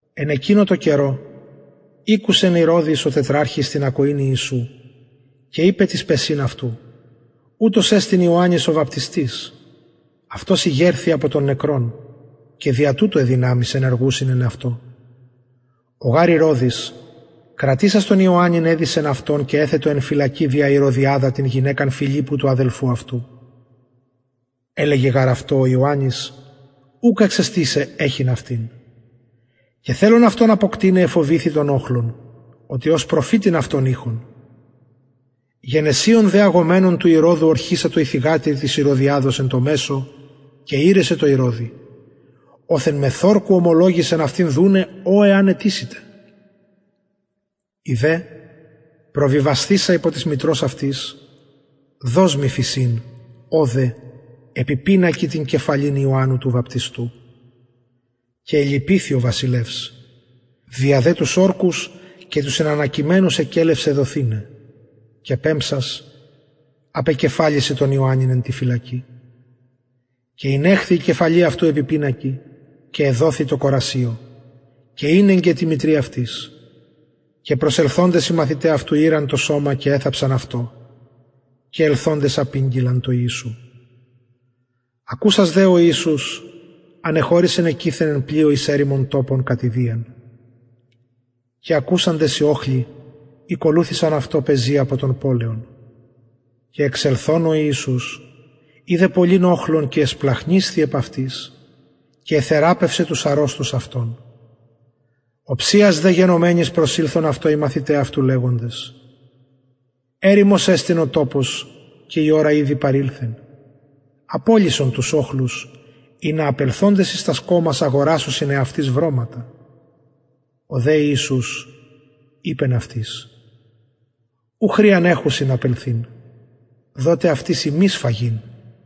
εν εκεινω τω καιρω ηκουσεν ηρωδης ο τετραρχης την ακοην ιησου και ειπεν τοις παισιν αυτου ουτος εστιν ιωαννης ο βαπτιστης αυτος ηγερθη απο των νεκρων και δια τουτο αι δυναμεις ενεργουσιν εν αυτω ο γαρ ηρωδης κρατησας τον ιωαννην εδησεν αυτον και εθετο εν φυλακη δια ηρωδιαδα την γυναικα φιλιππου του αδελφου αυτου ελεγεν γαρ αυτω ο ιωαννης ουκ εξεστιν σοι εχειν αυτην και θελων αυτον αποκτειναι εφοβηθη τον οχλον οτι ως προφητην αυτον ειχον γενεσιων δε αγομενων του ηρωδου ωρχησατο η θυγατηρ της ηρωδιαδος εν τω μεσω και ηρεσεν τω ηρωδη οθεν μεθ ορκου ωμολογησεν αυτη δουναι ο εαν αιτησηται η δε προβιβασθεισα υπο της μητρος αυτης δος μοι φησιν ωδε επι πινακι την κεφαλην ιωαννου του βαπτιστου και ελυπηθη ο βασιλευς δια δε τους ορκους και τους συνανακειμενους εκελευσεν δοθηναι και πεμψας απεκεφαλισεν τον ιωαννην εν τη φυλακη και ηνεχθη η κεφαλη αυτου επι πινακι και εδοθη τω κορασιω και ηνεγκεν τη μητρι αυτης και προσελθοντες οι μαθηται αυτου ηραν το σωμα και εθαψαν αυτο και ελθοντες απηγγειλαν τω ιησου και ακουσας ο ιησους ανεχωρησεν εκειθεν εν πλοιω εις ερημον τοπον κατ ιδιαν και ακουσαντες οι οχλοι ηκολουθησαν αυτω πεζη απο των πολεων και εξελθων ο ιησους ειδεν πολυν οχλον και εσπλαγχνισθη επ αυτοις και εθεραπευσεν τους αρρωστους αυτων οψιας δε γενομενης προσηλθον αυτω οι μαθηται αυτου λεγοντες ερημος εστιν ο τοπος και η ωρα ηδη παρηλθεν απολυσον τους οχλους ινα απελθοντες εις τας κωμας αγορασωσιν εαυτοις βρωματα ο δε ιησους ειπεν αυτοις ου χρειαν εχουσιν απελθειν δοτε αυτοις υμεις φαγειν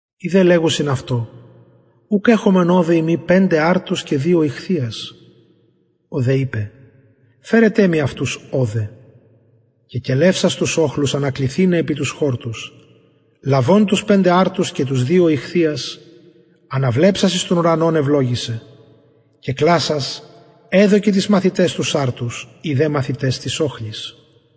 οι δε λεγουσιν αυτω ουκ εχομεν ωδε ει μη πεντε αρτους και δυο ιχθυας ο δε ειπεν φερετε μοι αυτους ωδε και κελευσας τους οχλους ανακλιθηναι επι τους χορτους λαβων τους πεντε αρτους και τους δυο ιχθυας αναβλεψας εις τον ουρανον ευλογησεν και κλασας εδωκεν τοις μαθηταις τους αρτους οι δε μαθηται τοις οχλοις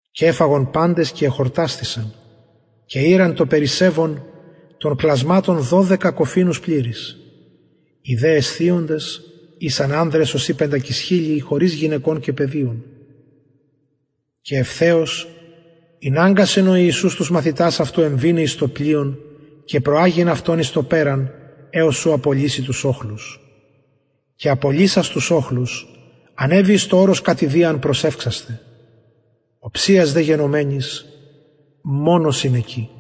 και εφαγον παντες και εχορτασθησαν και ηραν το περισσευον των κλασματων δωδεκα κοφινους πληρεις οι δε εσθιοντες ησαν ανδρες ωσει πεντακισχιλιοι χωρις γυναικων και παιδιων και ευθεως ηναγκασεν ο ιησους τους μαθητας εμβηναι εις το πλοιον και προαγειν αυτον εις το περαν εως ου απολυση τους οχλους και απολυσας τους οχλους ανεβη εις το ορος κατ ιδιαν προσευξασθαι οψιας δε γενομενης μονος ην εκει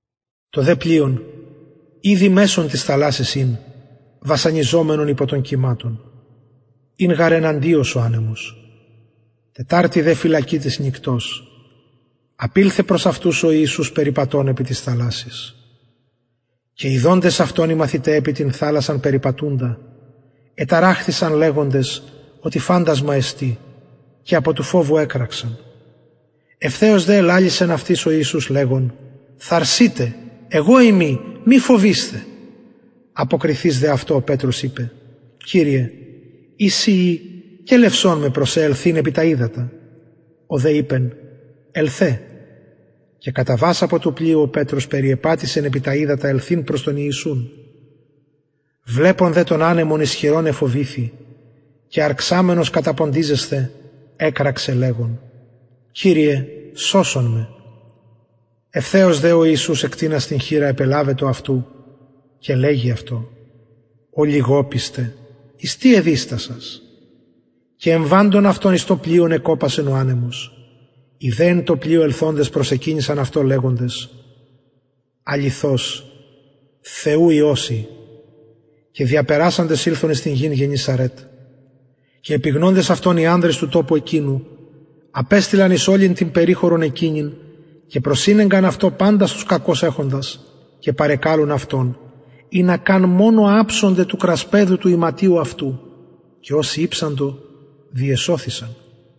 το δε πλοιον ηδη μεσον της θαλασσης ην βασανιζομενον υπο των κυματων ην γαρ εναντιος ο ανεμος τεταρτη δε φυλακη της νυκτος απηλθεν προς αυτους ο ιησους περιπατων επι της θαλασσης και ιδοντες αυτον οι μαθηται επι την θαλασσαν περιπατουντα εταραχθησαν λεγοντες οτι φαντασμα εστιν και απο του φοβου εκραξαν ευθεως δε ελαλησεν αυτοις ο ιησους λεγων θαρσειτε εγω ειμι μη φοβεισθε αποκριθεις δε αυτω ο πετρος ειπεν κυριε ει συ ει κελευσον με προς σε ελθειν επι τα υδατα ο δε ειπεν ελθε και καταβας απο του πλοιου ο πετρος περιεπατησεν επι τα υδατα ελθειν προς τον ιησουν βλεπων δε τον ανεμον ισχυρον εφοβηθη και αρξαμενος καταποντιζεσθαι εκραξεν λεγων κυριε σωσον με ευθεως δε ο ιησους εκτεινας την χειρα επελαβετο αυτου και λεγει αυτω ολιγοπιστε εις τι εδιστασας και εμβαντων αυτων εις το πλοιον εκοπασεν ο ανεμος οι δε εν τω πλοιω ελθοντες προσεκυνησαν αυτω λεγοντες αληθως θεου υιος ει και διαπερασαντες ηλθον εις την γην γεννησαρετ και επιγνοντες αυτον οι ανδρες του τοπου εκεινου απεστειλαν εις ολην την περιχωρον εκεινην και προσηνεγκαν αυτω παντας τους κακως εχοντας και παρεκαλουν αυτον ινα μονον αψωνται του κρασπεδου του ιματιου αυτου και οσοι ηψαντο διεσωθησαν